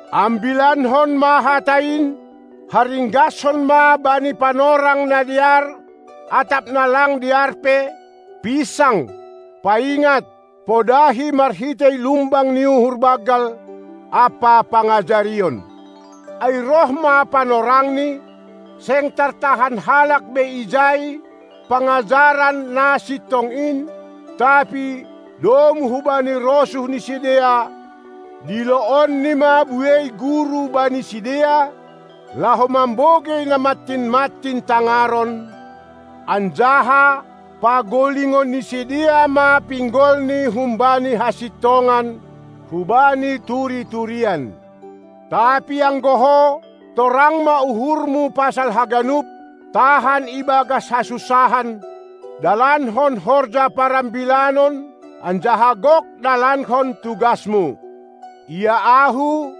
Ambilankon ma hata in, haringgashon ma bani panorang na dear atap na lang dear pe, pinsang, paingat, podahi marhitei lumbang ni uhur banggal ampa pangajarion. Ai roh ma panorangni, seng tartahan halak be ijai pangajaran na sintong in, tapi domu hubani rosuh ni sidea diloonni ma buei guru bani sidea, laho mambogei na mantin-mantin tangaron, anjaha pagolingon ni sidea ma pinggolni humbani hasintongan hubani turi-turian. Tapi anggo ho, torang ma uhurmu pasal haganup, tahan ibagas hasunsahan, dalankon horja parambilanon anjaha gok dalankon tugasmu. Ia ahu,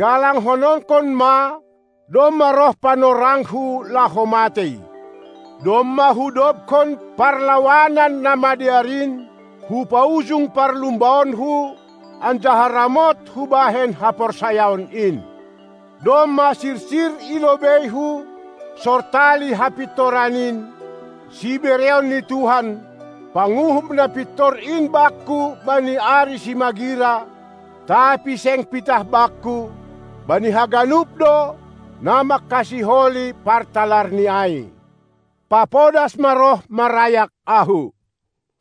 galanghononkon ma; domma roh panorangku laho matei. Domma hudobkon parlawanan na madear in, hupaujung parlumbaonku anjaha ramot hubahen haporsayaon in. Domma sirsir i lobeihu sortali hapintoran in, sibereon ni Tuhan, Panguhum na pintor in bakku bani ari simagira; tapi seng pitah bakku, bani haganup do, na manghasiholi partalarni ai. Papodas ma roh marayak ahu!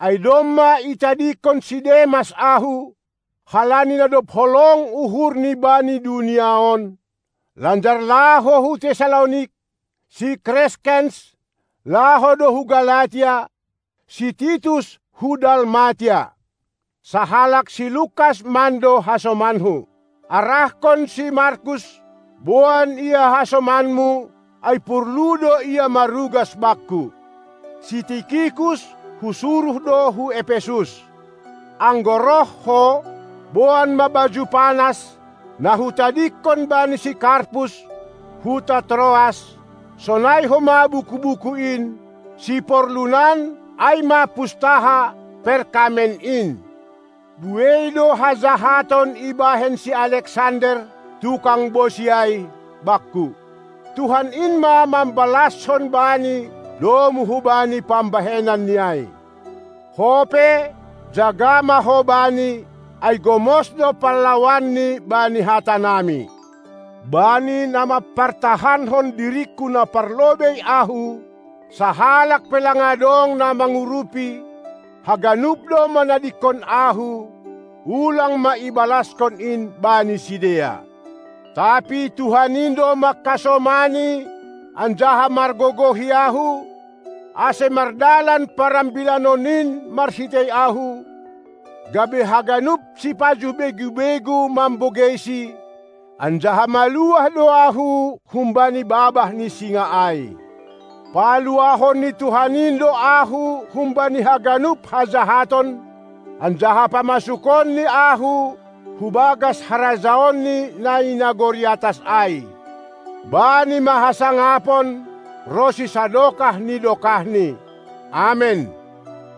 Ai domma itadingkon si Demas ahu, halani na dob holong uhurni bani dunia on, lanjar laho hu Tessalonik; si Kreskens laho do hu Galatia, si Titus hu Dalmatia. Sahalak si Lukas mando hasomanku. Arahkon si Markus, boan ia hasomanmu, ai porlu do ia marugas bakku. Si Tikikus, husuruh do hu Epesus. Anggo roh ho, boan ma baju panas, na hutadingkon bani si Karpus, huta Troas; sonai homa buku-buku in, siporlunan ai ma pustaha (perkamen) in. Buei do hajahaton ibahen si Aleksander, tukang bosi ai, bakku; Tuhan in ma mambalashon bani domu hubani pambahenanni ai. Ho pe, jaga ma ho bani, ai gomos do panlawanni bani hatanami. Bani na mampartahankon diringku na parlobei ahu, sahalak pe lang adong na mangurupi, haganup do manadingkon ahu; ulang ma ibalaskon in bani sidea. Tapi Tuhan in do mangkasomani anjaha margogohi ahu, ase mardalan parambilanon in marhitei ahu, gabe haganup sipajuh begu-begu mambogeisi; anjaha maluah do ahu humbani babah ni singa ai. Paluahon ni Tuhan in do ahu humbani haganup hajahaton, anjaha pamasukonni ahu hu bagas harajaonNi na i nagori atas ai. Bani ma hasangapon ronsi sadokah ni dokahni. Amen.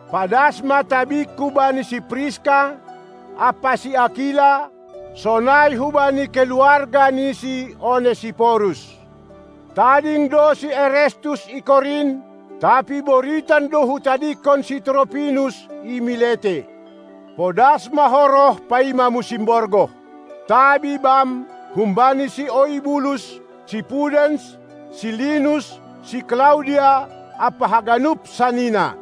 Padas ma tabingku bani si Priska ampa si Akila, sonai hubani keluarga ni si Onesiporus. Tading do si Erestus i Korint; tapi boritan do hutadingkon si Tropinus i Milete. Podas ma ho roh paima musim borgoh. Tabi bam humbani si Oibulus, si Pudens, si Linus, si Klaudia ampa haganup sanina.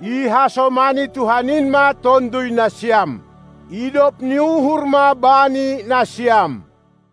Ihasomani Tuhan in ma tonduy nasiam! Idop ni uhur ma bani nasiam!